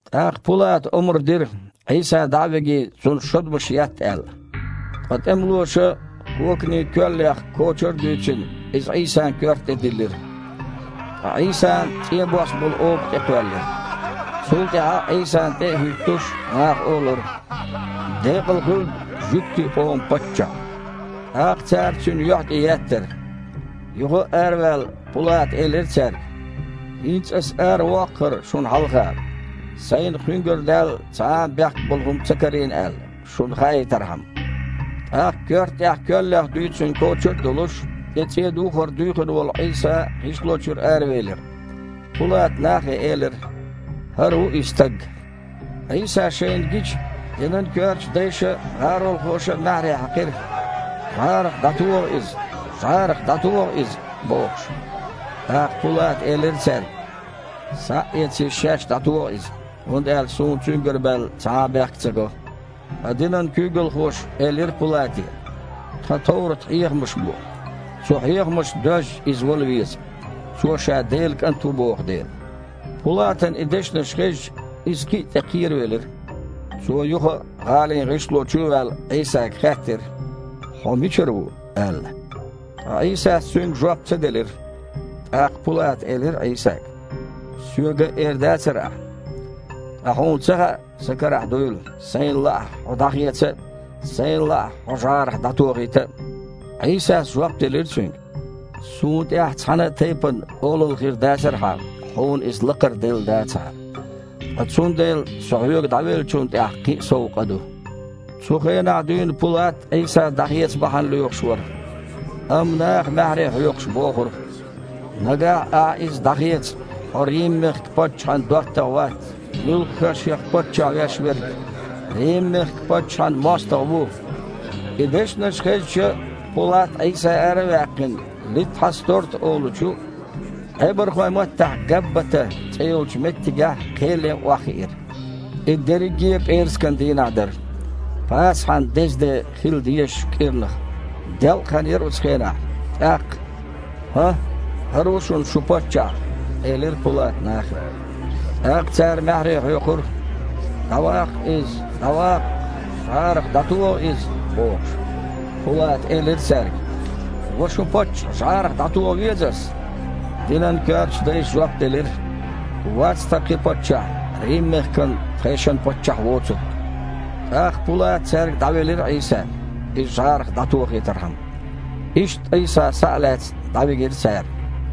ТІаккха Пулата омра дира, Іийса дІа а вигий, Цунна шодмаш етта аьлла. Ткъа тІемалоша, коканийн коьллех кочар а дуьйцина, иза Іийсан коьрта тІе диллира. Ткъа Іийсана цІен бос болу оба тІекхоьллира. Цул тІаьхьа, Іийсана тІе а хІуьттуш, наха олура: «Декъала хуьлда жуьгтийн къоман Паччахь!» ТІаккха цара Цуьнан юьхь тІе еттара. Юха а араваьлла, Пулата элира цаьрга: «ХІинца аса аравоккху ХІара шуна хьалха, сайна Кхуьнгара даьлла цхьа а бехк болу хІума ца карийна аьлла, шуна хаийтархьама». ТІаккха, коьрта тІехь коьллех дуьйцина кочар а долуш, тІе цІен духар дуьйхина волу Іийса гІишло чуьра аравелира. Пулата нахе элира: «ХІара ву и Стаг». Іийса шайна гича, динан коьртачу дайша а, гІаролхоша а маьхьарий хьаькхира: «ЖІарах дІатоха Иза! ЖІарах дІатоха Иза!» – бохуш. ТІаккха Пулата элира цаьрга: «Схьа а эций, шаьш дІатоха Иза, хІунда аьлча суна Цуьнгара баьлла цхьа а бехк ца го». Ткъа динан куьйгалхоша элира Пулате: «Тхан товрат-хьехамаш бу, цу хьехамашца доьзча, Иза вала веза, Цо Ша Делан КІант ву боху дела». Пулатана и дешнаш хезча, иза кхин тІе а кхеравелира. Цо, юха а гІалин гІишло чу а ваьлла, Іийсага хаьттира: «Хьо мичара ву?» – аьлла. Ткъа Іийсас цуьнга жоп ца делира. ТІаккха Пулата элира Іийсага: «Соьга а эр дацара Ахьа? Ткъа Хьуна ца хаьа, сан карахь дуйла, сайна лаахь, Хьо дІахеца а, сайна лаахь, Хьо жІарах дІатохийта а?» Іийсас жоп делира цуьнга: «Суна тІехь цхьана а тайпана олалла хир дацара хьан, хьуна иза лакхара делла дацахьара. Ткъа цундела Со хьоьга дІавеллачунна тІехь кхин а сов къа ду». Цу хенахь дуьйна Пулат Іийса дІахеца бахьана лоьхуш вара. Амма наха, маьхьарий хьоькхуш, бохура: «Нагахь ахьа Иза дІахецахь, хьо Рим-мехкан паччахьан доттагІа вац. Муьлхха а шех паччахь веш верг Рим-мехкан паччахьан мостагІа ву». И дешнаш хезча, Пулат, Іийса ара а ваьккхина, Литхьасторта олучу, Іебархойн маттахь Габбата цІе йолчу меттигехь кхел ян охьахиира. И дерриге а пІераскан дийнахь дара, Пасахьан деза де хила дезачу кІирнах. Делкъахан а яра цу хенахь. ТІаккха: «ХІан, ХІара ву шуна шун Паччахь!» – элира Пулата нахе. ТІаккха цара маьхьарий хьоькхура: «ДІаваккха Иза! ДІаваккха! ЖІарах дІатоха Иза!» – бохуш. Пулата элира цаьрга: «Ва шун Паччахь жІарах дІатоха веза ас?» Динан коьртачу дайша жоп делира: «Вац тхан кхин паччахь Рим-мехкан тхешан паччахь воцург». ТІаккха Пулата цаьрга дІавелира Іийса, Иза жІарах дІатохийтархьама. Иштта Іийса, схьа а лаьцна, дІавигира цара.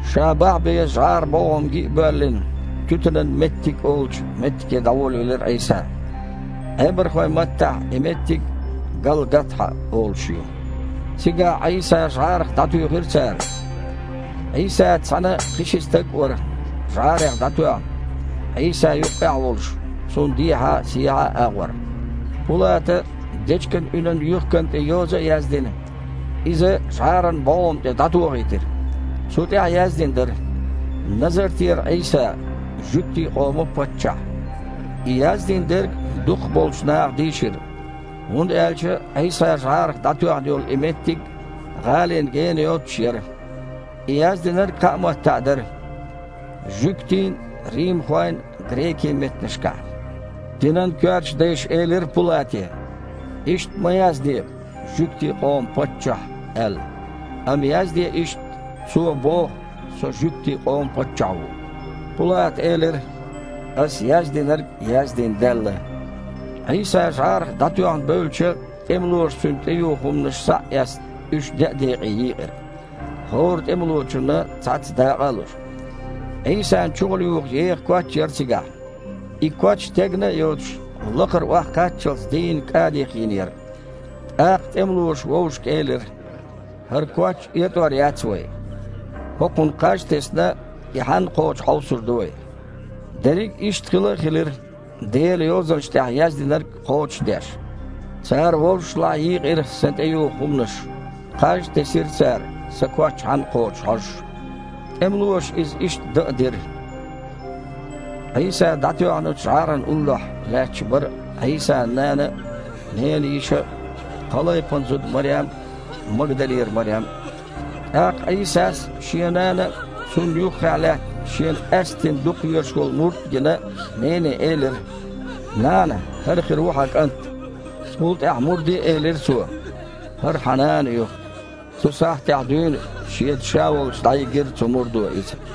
Ша бахьа беза жІаран бІогІам ги а боьллина, «туьтанан меттиг» олучу меттиге дІаволавелира Іийса (Іебархойн маттахь и меттиг «Галгатхьа» олуш ю). Цигахь Іийса жІарах дІатуьйхира цара. Іийсаца цхьаьна кхин а ши стаг вара жІарех дІатоьхна, Іийса юккъехь а волуш, Цунна дехьа а, сехьа а агІор. Пулата, дечиган уьнан юьхкана тІе йоза а яздина, иза жІаран бІогІам тІе дІатохийтира. Цу тІехь яздина дара: «Назартера Іийса, жуьгтийн къоман Паччахь». И яздина дерг дукхах болчу наха дийшира, хІунда аьлча Іийса жІарах дІатоьхна йолу и меттиг гІалина генахь йоццуш яра. И яздинарг кхаа маттахь дара: жуьгтийн, римхойн, грекийн меттанашкахь. Динан коьртачу дайша элира Пулате: «Иштта ма язде „Жуьгтийн къоман Паччахь“, – аьлла. Амма язде иштта: „Цо боху, Со Жуьгтийн къоман Паччахь ву“». Пулата элира: «Ас яздинарг яздина даьлла». Іийса жІарах дІатоьхна бевлча, тІемалоша Цуьнан тІеюху хІуманаш схьа а эцна, уьш деа декъе йийкъира, хІора тІемалочунна цхьацца дакъа а луш. Іийсан чухула юху еха коч а яра цигахь. И коч тегна а йоцуш, лакхара охьакхаччалц, дийнна кІадих йина яра. ТІаккха тІемалоша вовшашка элира: «ХІара коч этІор яц вай. ХІокхунна кхаж а тесна, и хьанна кхочу хьовсур ду вай». Дерриг а иштта хила а хилира, Делан Йозанашна тІехь яздинарг кхочушдеш: «Цара вовшашлахь йийкъира Сан тІеюху хІуманаш, кхаж а тесира цара, Сан коч хьанна кхочу хьожуш». ТІемалоша иза иштта дан а дира. Іийса дІатоьхначу жІарана уллохь лаьтташ бара Іийсан нана а, ненан йиша а, Кхалайпан зуда Марем а, Магдалера Марем а. ТІаккха Іийсас, Шен нана а, цунна юххехь лаьтта, Шена къаьсттина дукха везаш волу мурд а гина, нене элира: «Нана, хІара хир ву хьан кІант». Цул тІаьхьа мурде а элира Цо: «ХІара хьан нана ю». Цу сахьтехь дуьйна шеца ша волчу дІайигира цу мурдо иза.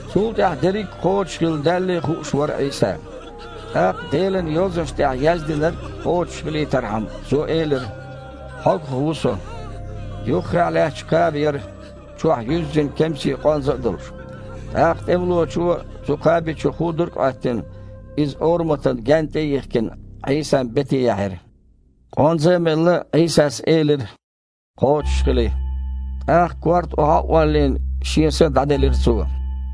Цул тІаьхьа дерриг а кхочушхилла даьллий хууш вара Іийса. ТІаккха, Делан Йозанашна тІехь яздинарг кхочушхилийтархьама, Цо элира: «Хьогах ву Со». Юххехь лаьтташ кхаба яра, чохь юьззина кемсийн къонза а долуш. ТІаккха тІемалочо, цу кхаби чу худург а Іоьттина, иза ораматан гаьнна тІе а йихкина, Іийсан бете яьхьира. Къонза а мелла, Іийсас элира: «Кхочушхили!» ТІаккха, корта охьа а оллийна, Шен са дІаделира Цо.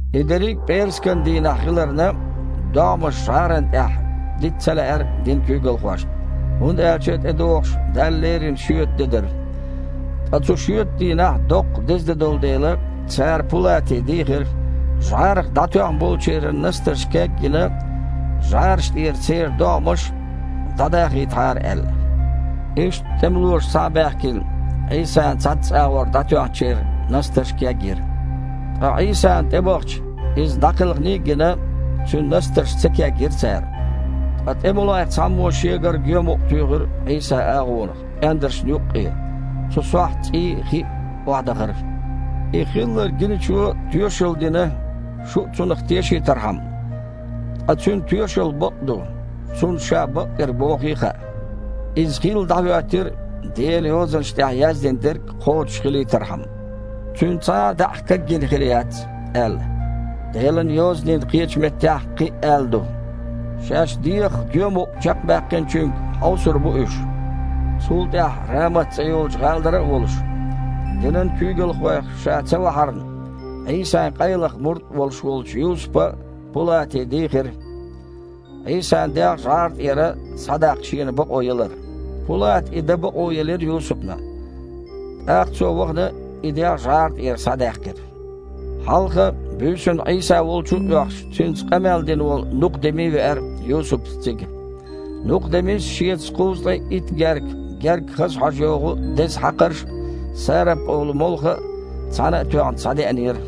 И дерриг пІераскан дийнахь хиларна, догІмаш жІарана тІехь дита ца лаьара динан куьйгалхошна, хІунда аьлча тІедогІуш Далла лерина шоьтан де дара. Ткъа цу шоьтан дийнахь доккха деза де долу дела, цара Пулате дийхира, жІарах дІатоьхна болчеран настарш каг а йина, жІараш тІера церан догІмаш дІадахийтахьара аьлла. Иштта тІемалоша, схьа а баьхкина, Іийсана цхьацца агІор дІатоьхначеран настарш кегйира. Ткъа Іийсана тІебахча, Иза дІакхелханий а гина, Цуьнан настарш ца кегйира цара. Ткъа тІемалойх цхьаммо шегара гоьмукъ туьйхира Іийсан агІонах, пІендаршна юккъе. Цу сохьта цІий а, хи а охьадахара. И хилларг гиначо тоьшалла дина, шу а цунах тешийтархьама. Ткъа цуьнан тоьшалла бакъ а ду, цунна ша бакъдерг бохий а хаьа. Иза хилла дІахІоьттира, Делан Йозанаш тІехь яздина дерг кхочушхилийтархьама: «Цуьнан цхьа а даьІахк кагйина хир яц», – аьлла. Делан Йозанийн кхечу меттехь кхин а аьлла ду: «Шаьш дегІах гоьмукъ чекхбаьккхиначуьнга хьовсур бу уьш». Цул тІаьхьа Рамат цІе йолчу гІалара а волуш, динан куьйгалхойх ша ца вахьарна, Іийсан къайлаха мурд а волуш волчу Юсупа Пулате дийхира, Іийсан дегІ жІара тІера схьадаккха шена бакъо ялар. Пулата и дан бакъо елира Юсупна. ТІаккха цо, вахана, и дегІ жІара тІера схьадаьккхира. Хьалха, буьйсанна Іийса волчу а оьхуш, Цуьнца къамел дина волу Нукха-Деми веара Юсупца цига. Нукха-Демис шеца кхузткъе итт герка гергга хаза хьожа йогІу деза хьакхарш а, сарап олу молха а, цхьаьна а тоьхна, схьадеанера.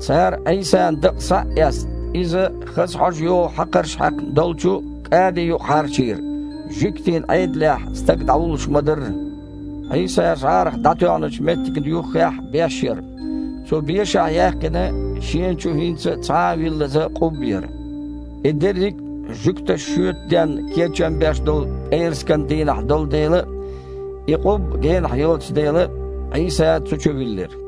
Цара, Іийсан дакъа схьа а эцна, Иза хаза хьожа йогІу хьакхарш хьаькхна долчу кІади юкъа хьарчийра, жуьгтийн Іедалехь стаг дІавуллуш ма-дарра. Іийса жІарах дІатоьхначу меттигна юххехь беш яра. Цу бешахь яьккхина, шена чу хІинца а цхьа а виллаза къубба яра. И дерриг а жуьгташа шоьтан денна кечам беш долу пІераскан дийнахь долу дела а, и къубба генахь йоцу дела а, Іийса цу чу виллира.